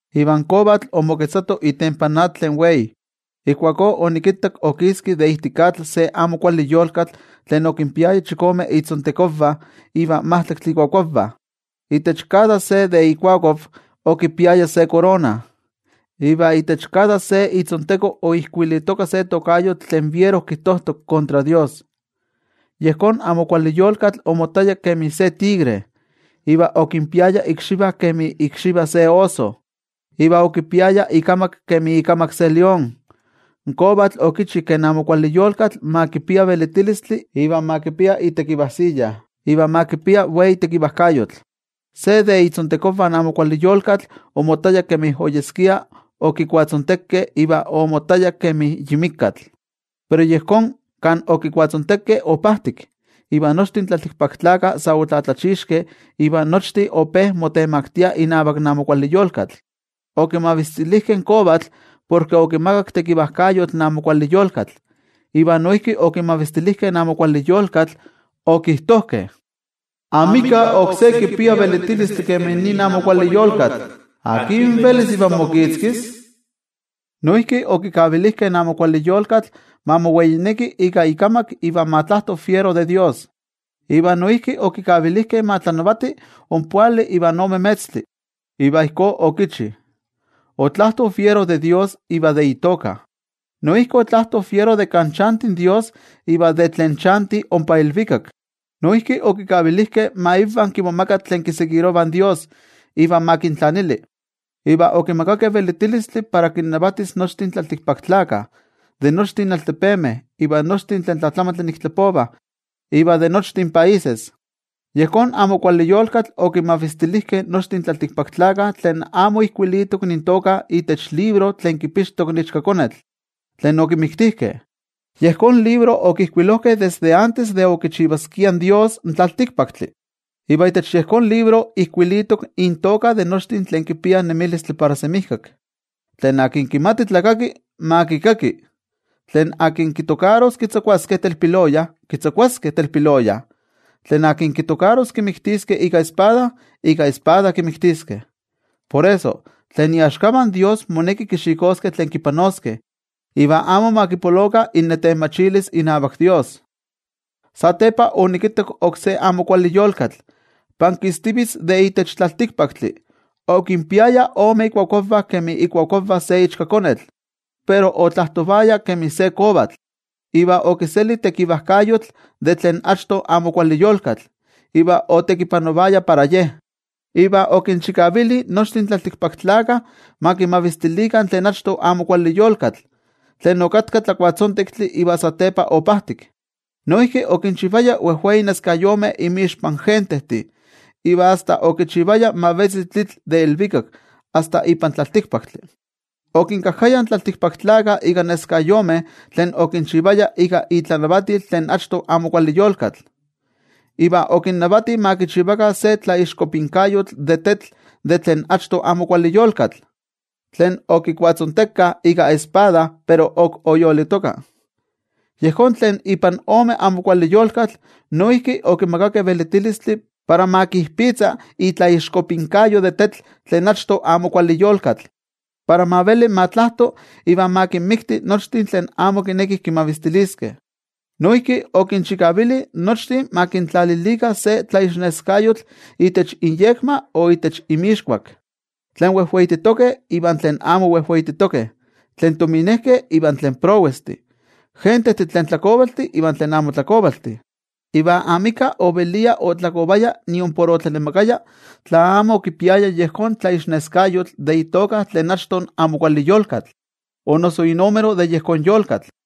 Iva in kovatl omoketzato itempan atl tlen wei. Ijkuakó onikittak okiski de ijtik atl se amo kuali yolkatl tlen okinpiaya chikome itzontekonvah iva majtlaktli ikuakuavah. Itech kada se ikuakuav okipiaya se korona, iva itech kada se itzonteko oijkuilitoka se tokayotl tlen fiero kijtojtok kontra toYejwatzi. Yejón amo kuali yolkatl omottaya kemi se tigre, iva okinpiaya ikxivah kemi ikxivah se oso, iva okipiaya ikamak kemi ikamak se lión. In kovatl okichi ke in amo kuali yolkatl ma kipia velitilistli iva ma kipia itekivajsiya, iva ma kipia wei tekivajkayotl. Se de itzontekonvah in amo kuali yolkatl omottaya kemi oyeskia okikuatzontekeh iva omottaya kemi yi mikatl. Pero yejón kan okikuatzontekeh opajtik, iva nochtin tlaltikpaktlakah sa otlatlachixkeh iva nochtin ope motemaktiah inavak in amo kuali yolkatl. Okimavistilijkeh in kovatl porke okimakak tekivajkayotl in amo kuali yolkatl, iva noijki okimavistilijkeh in amo kuali yolkatl. Okijtojkeh: —Amika oksé kipia velitilistli kemi nin amo kuali yolkatl. ¿Akin velis ivan mokitzkis? Noijki okikavilijkeh in amo kuali yolkatl ma moweineki ika ikamak iva ma tlajto fiero de toYejwatzi. Iva noijki okikavilijkeh ma tlanavati ompoali ivan ome metztli. Iva ijkó okichi. Otlajto fiero de toYejwatzi iva de itoka, noijki otlajto fiero de kan chanti in toYejwatzi iva de tlen chantih ompa ilvikak. Noijki okikavilijkeh ma invah kimomaga tlen kiseguirovah in toYejwatzi iva ma kintlanili. Iva okimakakeh velitilistli para kinnavatis nochtin tlaltikpaktlakah, de nochtin altepemeh, iva nochtin tlen tlatlamantli ik tlapovah iva de nochtin países. Yejón amo kuali yolkatl okimavistilijkeh nochtin tlaltikpaktlakah tlen amo ijkuilitok intoka itech libro tlen kipixtok in Ichkakonetl, tlen okimiktijkeh. Yejón libro okijkuilojkeh desde antes de okichivaskia in tlaltikpaktli in toYejwatzi, iva itech yejón libro ijkuilitok intoka de nochtin tlen kipiah nemilistli para semijkak. Tlen kimati tlakaki, ma kikaki. Tlen kitokaros kitzakuaskeh telpiloya, kitzakuaskeh telpiloya. Tlen kitokaros kimiktiskeh ika espada, ika espada kimiktiskeh. Por eso, tlen iaxkavah in toYejwatzi moneki kixikoskeh tlen kipanoskeh, iva amo ma kipolokah innetenmachilis inavak toYejwatzi. Satepa onikittak oksé amo kuali yolkatl, pankistivitz de itech tlaltikpaktli. Okinpiaya ome ikuakuavah kemi ikuakuavah se ichkakonetl, pero otlajtovaya kemi se kovatl. Iva okiseli tekivajkayotl de tlen achto amo kuali yolkatl, iva otekipanovaya para ye. Iva okinchikavili nochtin tlaltikpaktlakah ma kimavistilikah tlen achto amo kuali yolkatl, tlen okatka kuatlatzontektli iva satepa opajtik. Noijki okinchivaya wejwei tetzavkaneskayomeh inmixpan gentejtih, iva asta okichivaya ma vetzi tlitl de ilvikak asta ipan tlaltikpaktli. Okinkajkaya in tlaltikpaktlakah ika neskayomeh tlen okinchivaya ika itlanavatil tlen achto amo kuali yolkatl. Iva okinnavati ma kichivakah se tlaixkopinkayotl de tetl de tlen achto amo kuali yolkatl, tlen okikuatzontekah ika espada pero ok oyolitoka. Yejón tlen ipan ome amo kuali yolkatl noijki okimakakeh velitilistli para ma kijpitza itlaixkopinkayo de tetl tlen achto amo kuali yolkatl, para ma veli ma tlajto iva ma kinmikti nochtin tlen amo kinekih kimavistiliskeh. Noijki okinchikavili nochtin ma kintlalilikah se tlaixneskayotl itech inyekma o itech inmixkuak, tlen wejweititokeh ivan tlen amo wejweititokeh, tlen tominejkeh iva tlen prowestih, gentejtih tlen tlakovaltih iva tlen amo tlakovaltih. Iva amika ovelia otlakovaya niompor otlanemakaya tla amo okipiaya yejón tlaixneskayotl de itoka tlen achto amo kuali yolkatl o noso inúmero de yejón yolkatl.